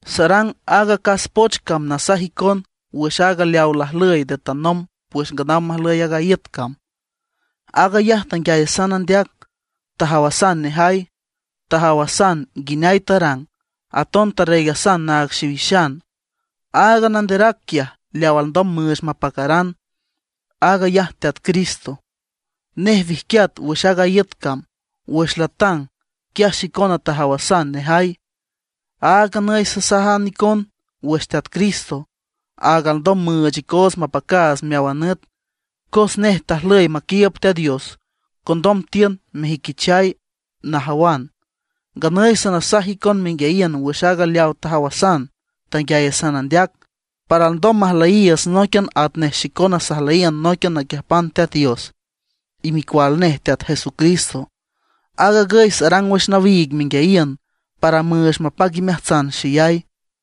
Sarang aaga acas poch cam nasaj icon wüx aaga leawa lajlüy nde tanomb wüx nganaw majlüy aaga iüt cam. Aag ayaj tanguiayasan andeac, tajawasan nejay, tajawasan nguineay arang, aton tarreegasan naag xiwixan. Aaga Nanderac quiaj leaw alndom müüch mapacaran, aag ayaj Teat Cristo. Nej wijquiat wüx aaga iüt cam. Wüx latang, quiaj xicona tajawasan nejay. Aag nganüy sasajan icon wüx Teat Cristo, aaga alndom müüch icoots mapacaats meáwan nüt. Cos nej tajlüy maquiiüb Teat Dios, condom tiün mejüiquichay najawan. Nganüy sanasaj icon menguiayiün wüx aaga leawa tajawasan, tanguiayasan andeac; para alndom majlüyiiüts nóiquian atnej xicona sajlüyiün nóiquian naquiüjpan Teat Dios y Micual nej Teat Jesucristo. Aag agüy sarang wüx nawiig menguiayiün, para müüch mapac imeajtsan xeyay.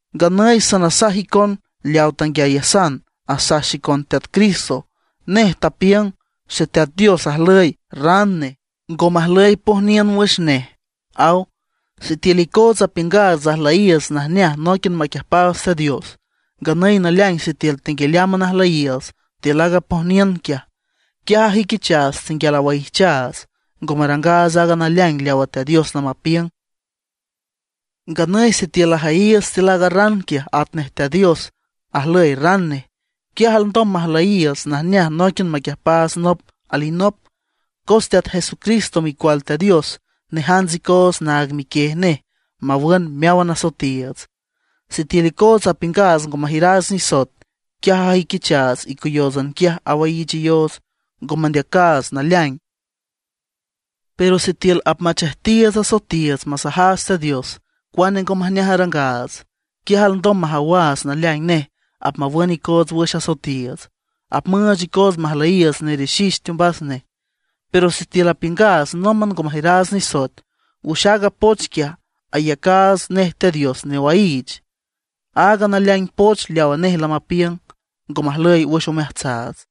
Nganüy sanasaj icon leaw tanguiayasan asaj xicon Teat Cristo. Nej tapiüng: “Xeteat Dios ajlüy ran nej, ngo majlüy pojniün wüx nej”, aw. Sitiül icootsa apiüngaats ajlüyiiüts najneaj nóiquian maquiüjpaats Teat Dios, nganüy naleaing sitiül tenguialeámban ajüyiiüts tiül aaga pojniün quiaj, quiaj ajüiquichaats tenguial awaijchaats, ngo marangaats aaga naleaing leawa Teat Dios lamapiüng. Nganüy sitiül ajüyiiüts tiül aaga ran quiaj atnej Teat Dios ajlüy ran nej, quiaj alndom majlüyiiüts najneaj nóiquian maquiüjpaats nop alinop. Cos Teat Jesucristo Micual Teat Dios nejants icoots naag miquiej nej mawün meáwan asoetiiüts. Sitiül icootsa apiüngaats ngo majiüraats nisoet, quiaj ajüiquichaats icoyóotsan quiaj awaiichayoots, ngo mandeacaats naleaing. Pero sitiül apmachejtiiüts asoetiiüts, masajaats Teat Dios cuane ngo majneaj arangaats, quiaj alndom majawaats naleaing nej apmawün icoots wüx asoetiiüts; apmüüch icoots majlüyiiüts nerixix teombas nej. Pero sitiül apiüngaats nómban ngo majiüraats nisoet, wüx aaga poch quiaj ayacaats nej Teat Dios newaiich, y aaga naleaing poch leawa nej lamapiüng, ngo majlüy wüx omeajtsaats.